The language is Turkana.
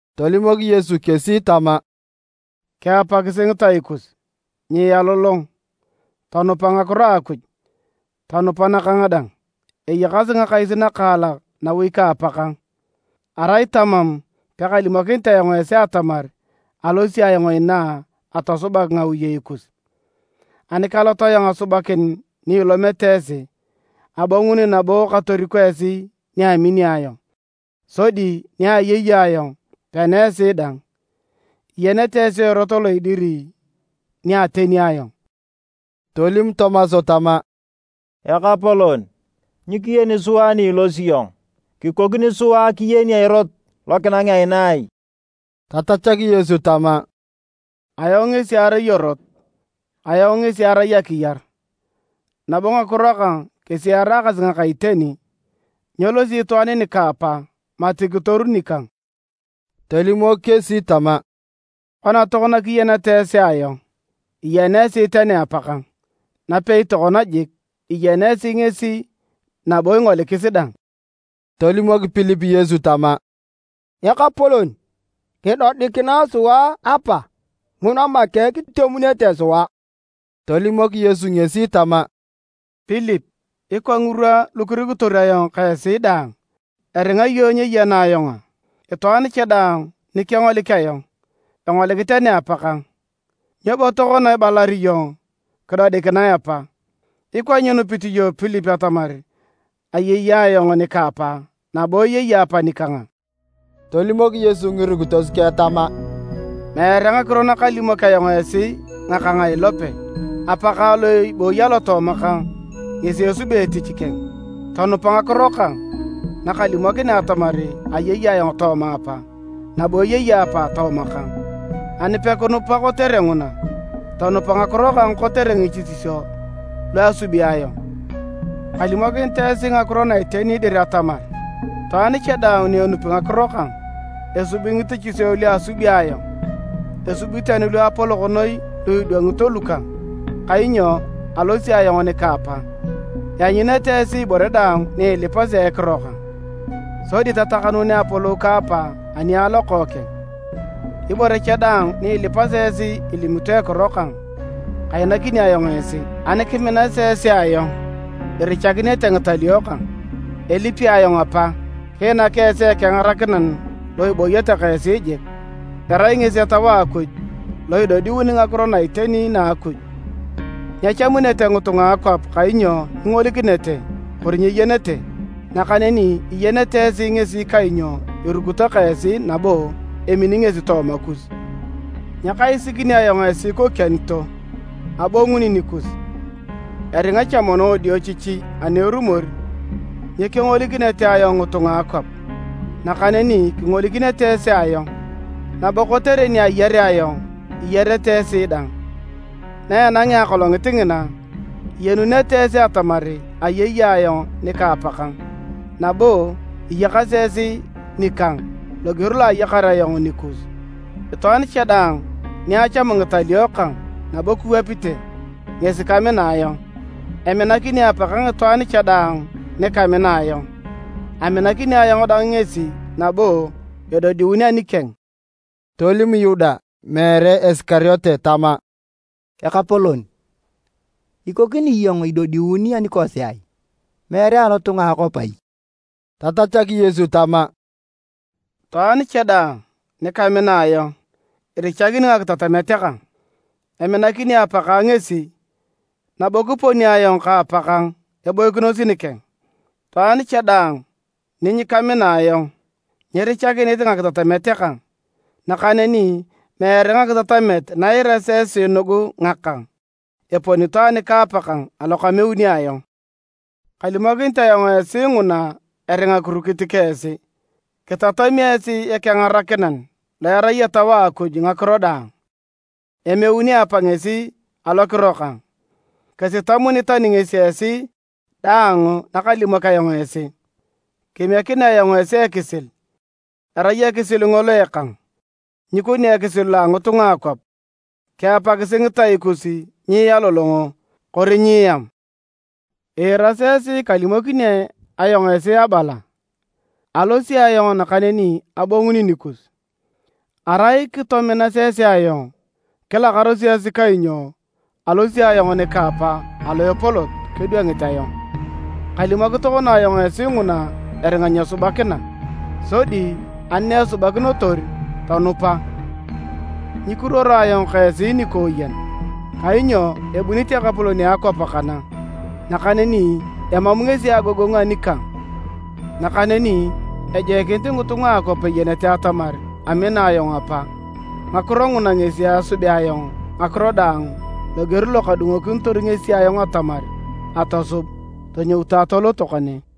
Tolimok Yesu kesi tama, “Kiapakisi ngitai kus, nyialolong, tonupa ngakiro a Akuj, tonupa nakang dang. Eyakasi ngakais nakaalak nawi ka Apakang, arai tamam, pekalimokinit ayong esi atamar alosi ayong inaa atosubak ngawiyei kus. Ani kalot ayong asubakin ni ilomete esi, abonguni nabo katoriko esi ni amini ayong, sodi ni ayei ayong, pena esi dang. Iyenete esi erot lo idiri ni ateni ayong.” Tolim Tomas tama, “Ekapolon, nyikiyeni sua ni ilosi iyong, kikokini sua kiyeni erot lokinangea inaa ai?” Tatachak Yesu tama, “Ayong ngesi arai erot, ayong ngesi arai akiyar, nabo ngakiro kang kesi eraakasi ngaka iteni, nyelosi itwaan nika Apa mati kitoru nikang.” Tolimok kesi tama, “Kona tokona kiyeneta esi ayong, iyena esi tani Apakang. Napei tokona jik, iyena esi ngesi nabo ingolikis dang.” Tolimok Pilip Yesu tama, “Ekapolon, kidodikinae sua Apa, nguna make kitemunete sua.” Tolimok Yesu ngesi tama, “Pilip, ikwa ngirwa lukirukitor ayong ka esi daang, eringa iyong nyeyena ayong a? Itwaan cha daang ni kengolik ayong, engolik tani Apakang, nyo bo tokona ibalar iyong, ‘Kidodikinae Apa?’ Ikwa nyinupit iyong Pilip atamar ayei ayong nika Apa, nabo eyei Apa nikang a?” Tolimok Yesu ngirukitos keng tama, “Meere ngakiro nakalimok ayong esi ngakang a ilope, Apakang lo ibooyi alotooma kang ngesi esubi etich keng. Tonupa ngakiro kang nakalimokinea atamar ayei ayong tooma Apa, nabo eyei Apa tooma kang, ani pekinupa kotere nguna, tonupa ngakiro kang kotere ngitichisio luasubi ayong. “Kalimokinit esi ngakiro na iteni dir atamar, itwaan cha daang ni enupi ngakiro kang, esubi ngitichisio luasubi ayong, esubi tani luapolok noi lu idwangito lukang, kainyo alosi ayong nika Apa. Ianyunete esi ibore daang ni ilipasi a ekiro kang, sodi tatakanuunea apolou ka Apa ani a Lokookeng. Ibore cha daang ni ilipasi esi ilimito ekiro kang, kainakini ayong esi. “Ani kiminasi esi ayong, irichakinete ngitalio kang. Elipi ayong Apa, kiinak esi Ekengarakinan lo ibooyete ka esi jiik. Erai ngesi Etau a Akuj lo idodiuni ngakiro na iteni na a Akuj. Nyechamunete ngitunga a akwap kainyo nyingolikinete kori nyeyenete, nakaneni iyenete esi ngesi kainyo irukito ka esi nabo emini ngesi tooma kus. “Nyakaisikini ayong esi ikokianito, abonguni nikus. Eringa cha mono wadiochichi ani erumor nyekengolikinete ayong ngitunga a akwap, nakaneni kingolikinete esi ayong, nabo kotere ni ayarea ayong, iyarete esi dang. Na enangea akolongit ngina, iyenunete esi atamar ayei ayong nika Apakang, nabo iyakasi esi nikang loger lo ayakar ayong nikus. “Itwaan cha daang ni achamu ngitalio kang nabo kiwapite, ngesi kamina ayong. Eminakini Apakang itwaan cha daang nikamina ayong, aminakini ayong dang ngesi nabo edodiun anikeng.” Tolim Yuda (meere Isikariote) tama, “Ekapolon, ikokini iyong idodiun anikosi, meere alotunga a akwap ai?” Tatachak Yesu tama, “Itwaan cha daang nikamina ayong, irichakini ngakitatamet kang. Eminakini Apakang ngesi, nabo kiponi ayong ka Apakang eboikinos nikeng. Itwaan cha daang ninyakamina ayong, nyirichakinit ngakitatamet kang. Nakaneni meere ngakitatamet na iirasi esi nugu ngakang, eponito anika Apakang alo kameuni ayong. “Kalimokinit ayong esi nguna eringa kirukit ka esi. Kitatami esi Ekengarakinan, lo erai Etau a Akuj ngakiro daang, emeuni Apa ngesi alokiro kang. Kisitamuni tani ngesi esi daang nakalimok ayong esi. “Kemiekinea ayong esi ekisil, erai ekisil ngolo ekang, nyikoni ekisil lo a ngitunga a akwap. Kiapakisi ngitai kus nyialolongo, kori nyieam. Iirasi esi kalimokini ayong esi abala, ‘Alosi ayong nakaneni abonguni nikus.’ Arai kitominas esi ayong, kilakarosi kainyo alosi ayong nika Apa alo epolot kedwangit ayong. Kalimok tokona ayong esi nguna eringa nyesubakina, sodi ani naesubakinotor, tonupa. Nyikiruoro ayong ka esi nikooyen, kainyo ebunit ekapolon a akwap kana. Nakaneni emam ngesi agogongu anikang, nakaneni ejoikinit ngitunga a akwap eyenete atamar amina ayong Apa, ngakiro nguna ngesi asubea ayong ngakiro daang loger lo kadungokinitor ngesi ayong atamar atosub. Tonyoutu atoloto kane.